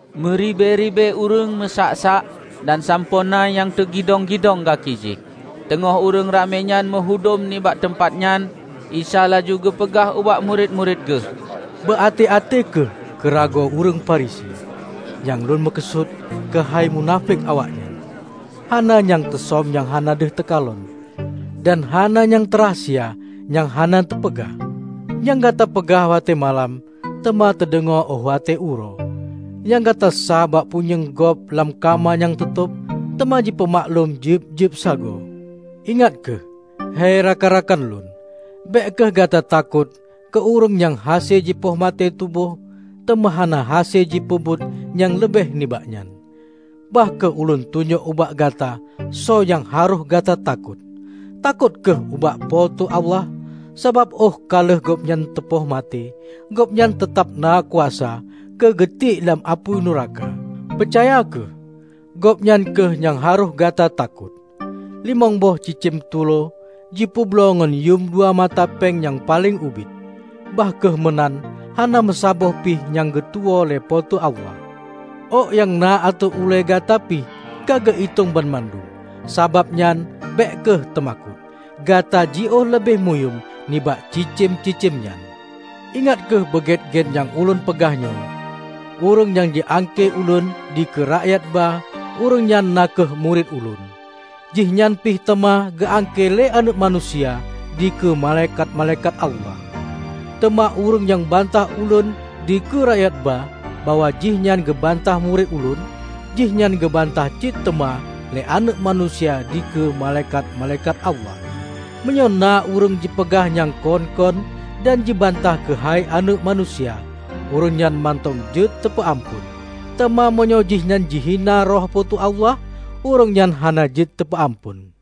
Meuribée-ribée ureuëng meusak-sak dan sampoe na nyang teugidong-gidong gaki jih. Teungoh ureuëng ramé nyan meuhudom nibak teumpat nyan, Isa laju geupeugah ubak murit-murit geuh, "Beuaté-até kheueh keu ragoe ureuëng Firisi, nyang Lôn meukeusut, keuhai munafék awaknyan. Hana nyang teusöm nyang hana deuh teukalon, dan hana nyang teurahsia nyang hana teupeugah. Nyang gata peugah watée malam, teuma teudeungoe óh watée uroe; nyang gata sáh bak punyueng gob lam kama nyang teutôb, teuma jipeumaklum jeueb-jeueb sagoe." "Ingat kheueh, hei rakan-rakan Lôn! Bék kheueh gata takot keu ureuëng nyang hase jipoh maté tuboh teuma hana hase jipeubuet nyang leubeh nibak nyan. Bah kheueh Ulôn tunyok ubak gata soe nyang harôh gata takot. Takot kheueh ubak Po teu Allah! Sabab óh ka lheueh gobnyan teupoh maté, Gobnyan teutab na kuasa keu geutiek lam apui nuraka! Peucaya kheueh, Gobnyan kheueh nyang harôh gata takot. Limong boh cicém tulo jipeubloe ngon yuem dua mata péng nyang paleng ubit. Bah kheueh meunan hana meusaboh pih nyang geutuwoe lé Po teu Allah. Ôk nyang na ateueh ulée gata pih ka geuitong banmandum, sabab nyan bék kheueh teumakot; gata jiôh leubeh muyuem nibak cicém-cicém nyan!" "Ingat kheueh beu gét-gét nyang Ulôn peugah nyoe: Ureuëng nyang jiangkée Ulôn dikeue rakyat ba ureuëng nyan na kheueh murit Ulôn, jihnyan pih teuma geuangkée lé Aneuëk Manusia dikeue malaikat-malaikat Allah. Teuma ureuëng nyang bantah Ulôn dikeue rakyatba bahwa jihnyan geubantah murit Ulôn, jihnyan geubantah cit teuma lé Aneuëk Manusia dikeue malaikat-malaikat Allah. Meunyoe na ureuëng jipeugah nyang kon-kon dan jibantah keuhai Aneuëk Manusia, ureuëng nyan mantong jeuet teupeu amphon; teuma meunyoe jihnyan jihina Roh Po teu Allah, ureuëng nyan hana jeuet teupeu amphon.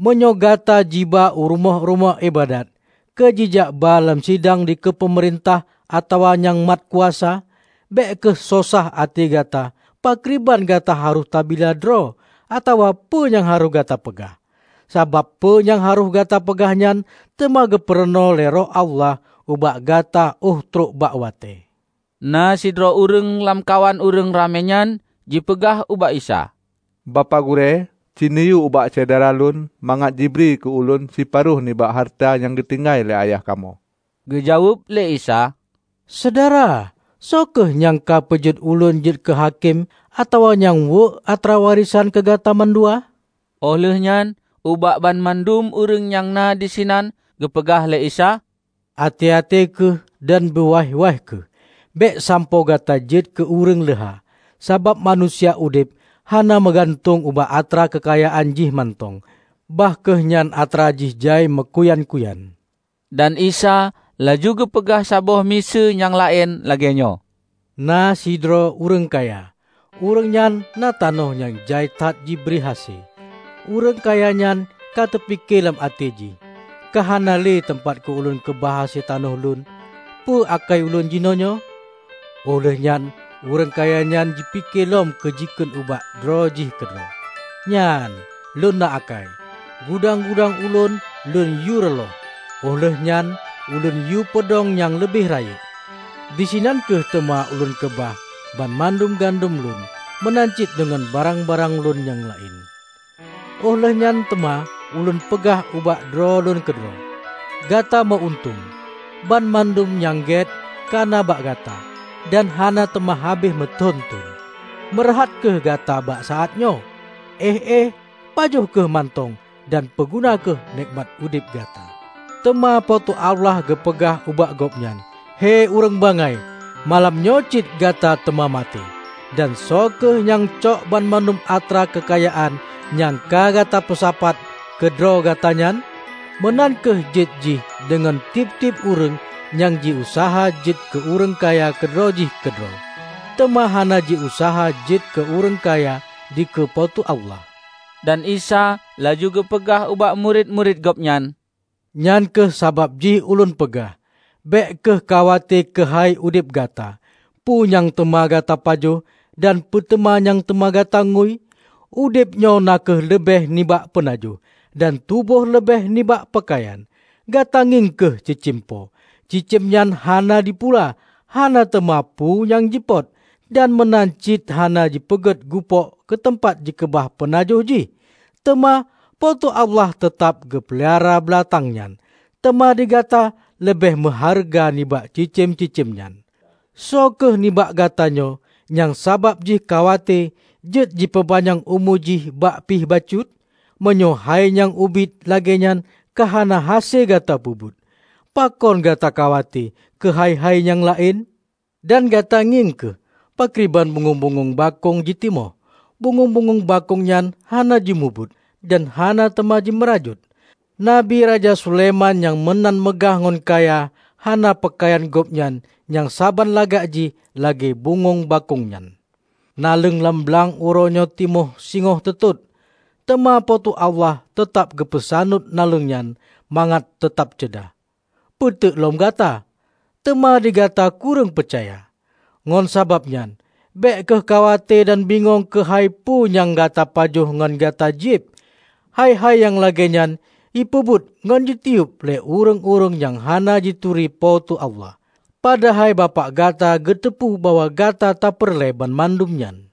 Meunyoe gata jiba u rumoh-rumoh iébadat keu jijak ba lam sidang dikeue peumeurintah atawa nyang mat kuasa, bék kheueh sosah até gata pakriban gata harôh tabila droe atawa peue nyang harôh gata peugah. Sabab peue nyang harôh gata peugahnyan teuma geupurunoe lé Roh Allah ubak gata óh trok bak watée." Na sidroe ureuëng lamkawan ureuëng ramé nyan jipeugah ubak Isa, "Bapak Gurée, cineuyue ubak syedara lôn mangat jibri keu ulôn siparo nibak hareuta nyang geutinggai lé ayah kamoe." Geujaweueb lé Isa, "Syedara, soe kheueh nyang ka peujeuet ulôn jeuet keuhakém atawa nyang weuek atra warésan keu gata mandua?" Óh lheuehnyan ubak banmandum ureuëng nyang na disinan geupeugah lé Isa, "Até-até kheueh dan beuwaih-waih kheueh, bék sampoe gata jeuet keu ureuëng leuha. Sabab manusia udeb hana meugantung bak atra keukayaan jih mantong, bah kheueh nyan atra jih jai meukuyan-kuyan." Dan Isa laju geupeugah saboh miseue nyang laén lagée nyoe, "Na sidroe ureuëng kaya. Ureuëng nyan na tanoh nyang jai that jibri hase. Ureuëng kaya nyan ka teupike lam até jih, 'Ka hana le teumpat keu lôn keubah hase tanoh lôn. Peue akai ulôn jinoenyoe?' Óh lheuehnyan ureuëng kaya nyan jipike lom jikheun ubak droe jih keudroe, 'Nyan, lôn na akai; gudang-gudang ulôn lôn yue reuloh óh lheuehnyan ulôn yue peudong nyang leubeh rayeuk. Disinan kheueh teuma ulôn keubah banmandum gandom lôn meunan cit deungon barang-barang ulôn nyang laén. Óh lheueh nyan teuma ulôn peugah ubak droe lôn keudroe: Gata meu-untông! Banmandum nyang gét ka na bak gata dan hana teuma habéh meuthon-thon. Meureuhat kheueh gata bak saát nyoe! Éh-éh pajoh kheueh mantong dan peuguna kheueh nékmat udeb gata!' Teuma Po teu Allah geupeugah ubak gobnyan, 'Hei ureuëng bangai! Malam nyoe cit gata teuma maté, dan soe kheueh nyang cok banmandum atra keukayaan nyang ka gata peusapat keu droe gata nyan?' Meunan kheueh jeuet jih deungon tieb-tieb ureuëng nyang jiuseuha jeuet keu ureuëng kaya keudroe jih keudroe, teuma hana jiuseuha jeuet keu ureuëng kaya dikeue Po teu Allah." Dan Isa laju geupeugah ubak murit-murit Gobnyan, "Nyan kheueh sabab jih ulôn peugah, 'Bék kheueh khawate keuhai udeb gata, peue nyang teuma gata pajoh, dan peuteuma nyang teuma gata ngui.' Udebnyoe na kheueh leubeh nibak peunajoh, dan tuboh leubeh nibak peukayan. Gata ngieng kheueh cicém po! Cicém nyan hana jipula, hana teuma peue nyang jipot, dan meunan cit hana jipeugét gupôk keuteumpat jikeubah peunajoh jih. Teuma, Po teu Allah teutab geupeulara beulatang nyan! Teuma digata leubeh meuhareuga nibak cicém-cicém nyan! Soe kheueh nibak gatanyoe nyang sabab jih khawate jeuet jipeupanyang umu jih bah pih bacut? Meunyoe hai nyang ubit lagée nyan ka hana hase gata peubuet, pakon gata khawate keuhai-hai nyang laén? Dan gata ngieng kheueh pakriban bungöng-bungöng bakông jitimoh; bungöng-bungöng bakông nyan hana jimubuet, dan hana teuma jimeurajôt. Nabi Raja Sulaiman nyang meunan meugah ngon kaya hana peukayan gobnyan nyang saban lagak jih lagée bungöng bakông nyan! Naleueng lam blang uroe nyoe timoh singoh teutot. Teuma Po teu Allah teutab geupeusaneut naleueng nyan mangat teutab ceudah. Peuteuk lom gata! Teuma digata kureueng peucaya! Ngon sabab nyan, bék kheueh khawate dan bingong keuhai peue nyang gata pajoh ngon gata jieb. Hai-hai nyang lagée nyan jipeubuet ngon jitiyeub lé ureuëng-ureuëng nyang hana jituri Po teu Allah. Padahai Bapak gata geuteupeue bahwa gata tapeureulée banmandum nyan.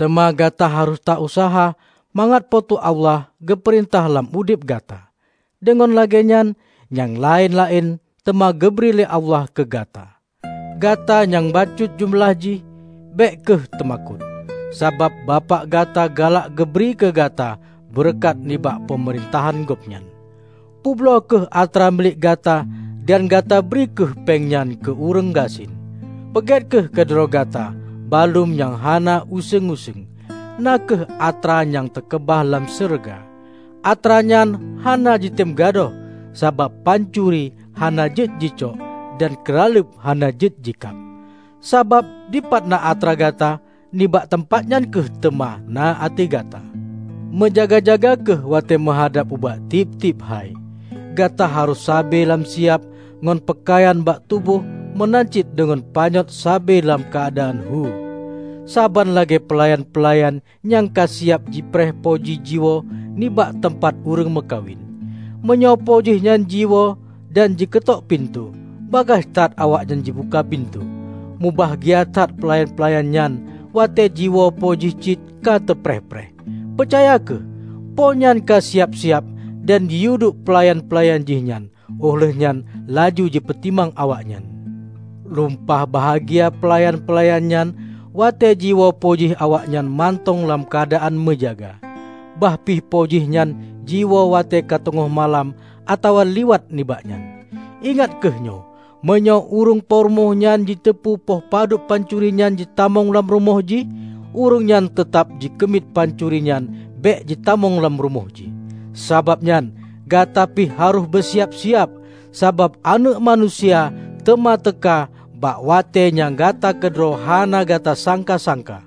Teuma gata harôh ta useuha mangat Po teu Allah geupeurintah lam udeb gata, deungon lagée nyan nyang laén-laén teuma geubri lé Allah keu gata." "Gata nyang bacut jeumeulah jih, bék kheueh teumakot! Sabab Bapak gata galak geubri keu gata beureukat nibak Peumeurintahan Gobnyan. Peubloe kheueh atra milék gata dan gata bri kheueh péng nyan keu ureuëng gasien. Peugét kheueh keu droe gata baluem nyang hana useueng-useueng, na kheueh atra nyang teukeubah lam syeuruga. Atranyan hana jitem gadôh sabab pancuri hana jeuet jicok dan keuraleueb hana jeuet jikab. Sabab dipat na atra gata, nibak teumpat nyan kheueh teuma na até gata!" "Meujaga-jaga kheueh watée meuhadab ubak tieb-tieb hai. Gata harôh sabe lam siab ngon peukayan bak tuboh meunan cit deungon panyöt sabe lam keuadaan hu, saban lagée peulayan-peulayan nyang ka siab jipreh Po jih jiwoe nibak teumpat ureuëng meukawen. Meunyoe Po jih nyan jiwoe dan jikeutok pintoe, bagaih that awaknyan jibuka pintoe. Mubahgia that peulayan-peulayan nyan watée jiwoe Po jih cit ka teupreh-preh. Peucaya kheueh: Po nyan ka siab-siab dan jiyueduek peulayan-peulayan jih nyan, óh lheueh nyan laju jipeutimang awaknyan. Lumpah mubahgia peulayan-peulayan nyan watée jiwoe Po jih awaknyan mantong lam keuadaan meujaga, bah pih Po jih nyan jiwoe watée ka teungoh malam atawa liwat nibak nyan! Ingat kheueh nyoe! Meunyoe ureuëng po rumoh nyan jiteupeu poh padub pancuri nyan jitamong lam rumoh jih, ureuëng nyan teutab jikeumiet pancuri nyan bék jitamong lam rumoh jih. Sabab nyan, gata pih harôh beusiab-siab, sabab Aneuëk Manusia teuma teuka bak watée nyang gata keudroe hana gata sangka-sangka."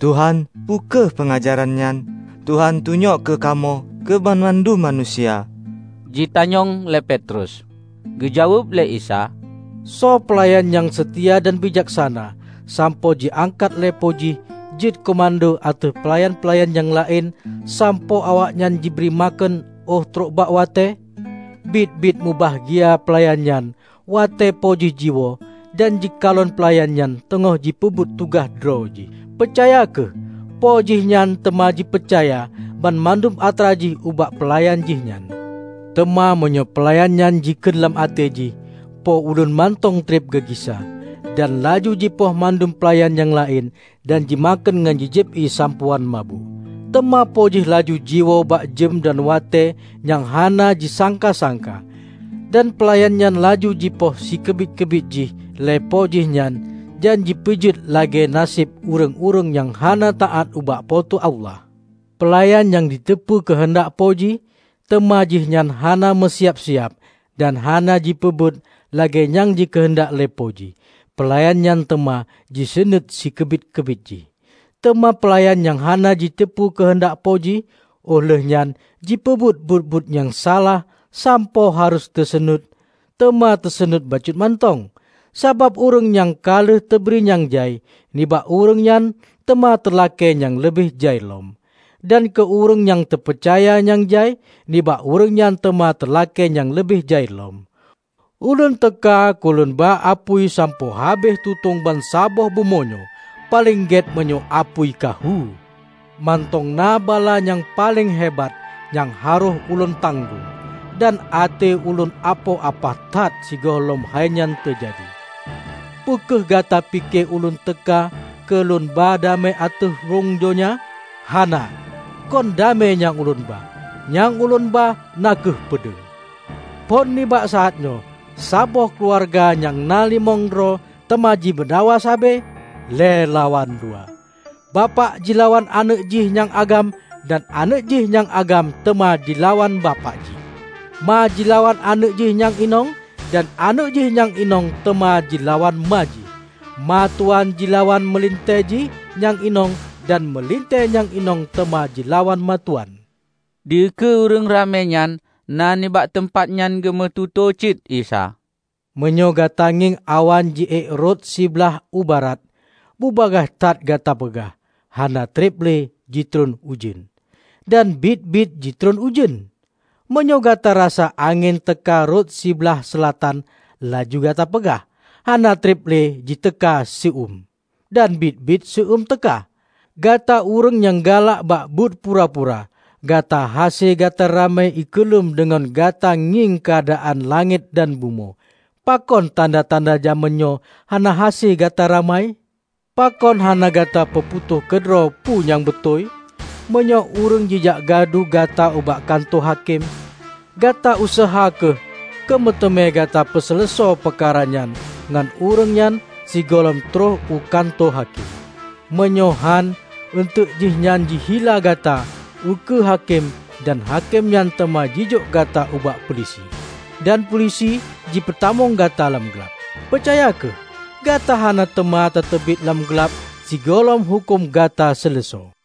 "Tuhan, peu kheueh peungajaran nyan Tuhan tunyok keu kamoe keu banmandum manusia?" jitanyong lé Petrus. Geujaweueb lé Isa, "Soe peulayan nyang seutia dan bijaksana sampoe jiangkat lé po jih jeuet keumando ateueh peulayan-peulayan nyang laén sampoe awaknyan jibri makheun óh trok bak watée? Biet-biet mubahgia peulayan nyan watée Po jih jiwoe dan jikalon peulayan nyan teungoh jipeubuet tugaih droe jih! Peucaya kheueh: Po jihnyan teuma jipeucaya banmandum atra jih ubak peulayan jih nyan. Teuma meunyoe peulayan nyan jikheun lam até jih, 'Po ulôn mantong treb geugisa,' dan laju jipoh mandum peulayan nyang laén dan jimakheun ngon jijieb ié sampoe án mabök, teuma Po jih laju jiwoe bak jeuem dan watée nyang hana jisangka-sangka. Dan peulayan nyan laju jipoh sikeubiet-keubiet jih lé Po jihnyan dan jipeujeuet lagée naseb ureuëng-ureuëng nyang hana taát ubak Po teu Allah. Peulayan nyang jiteupeu keuheundak Po jih, teuma jihnyan hana meusiab-siab dan hana jipeubuet lagée nyang jikeuheundak lé Po jih, peulayan nyan teuma jiseunuét sikeubiet-keubiet jih. Teuma peulayan nyang hana jiteupeu keuheundak Po jih, óh lheueh nyan jipeubuet buet-buet nyang salah sampoe harôh teuseunuet, teuma teuseunuet bacut mantong. Sabab ureuëng nyang ka lheueh teubri nyang jai, nibak ureuëng nyan teuma teulakée nyang leubeh jai lom. Dan keu ureuëng nyang teupeucaya nyang jai, nibak ureuëng nyan teuma teulakée nyang leubeh jai lom." "Ulôn teuka keu lôn ba apui sampoe habéh tutong bansaboh bumoe nyoe. Paleng gét meunyoe apui ka hu! Mantong na bala nyang paleng hebat nyang harôh Ulôn tanggong. Dan até ulôn apoh apah that sigohlom hainyan teujadi. Peu kheueh gata pike ulôn teuka keu lôn ba damé ateueh rhung donya? Hana, kon damé nyang ulôn ba, nyang ulôn ba na kheueh peudeueng. Phon nibak saát nyoe, saboh keuluwarga nyang na limong droe teuma jimeudakwa sabe, lhée lawan dua. Bapak jilawan aneuëk jih nyang agam dan aneuëk jih nyang agam teuma jilawan bapak jih. Ma jilawan aneuëk jih nyang inong dan aneuëk jih nyang inong teuma jilawan ma jih. Ma tuwan jilawan meulintée jih nyang inong dan meulintée nyang inong teuma jilawan ma tuwan." Dikeue ureuëng ramé nyang na nibak teumpat nyan geumeututoe cit Isa, "Meunyoe gata ngieng awan ji ék rot siblaih u barat, bubagaih that gata peugah, 'Hana treb le jitron ujeuen.' Dan biet-biet jitron ujeuen. Meunyoe gata rasa angén teuka rot sibalih seulatan, laju gata peugah, 'hana treb le jiteuka seu-eum.' Dan biet-biet seu-eum teuka. Gata ureuëng nyang galak bak buet pura-pura! Gata hase gata ramai ikeulem deungon gata ngieng keuadaan langét dan bumoe. Pakon tanda-tanda jamén nyoe hana hase gata ramai?" "Pakon hana gata peuputôh keudroe peue nyang beutôi? Meunyoe ureuëng jijak gadu gata ubak kantô hakém, gata useuha kheueh keu meuteumé gata peuseuleusoe peukara nyan ngon ureuëng nyan sigohlom troh u kantô hakém. Meunyoe hán, eunteuk jihnyan jihila gata u keue hakém dan hakém nyan teuma jijok gata ubak peulisi, dan peulisi jipeutamong gata lam glab. Peucaya kheueh! Gata hana teuma tateubiet lam glab sigohlom huköm gata seuleusoe."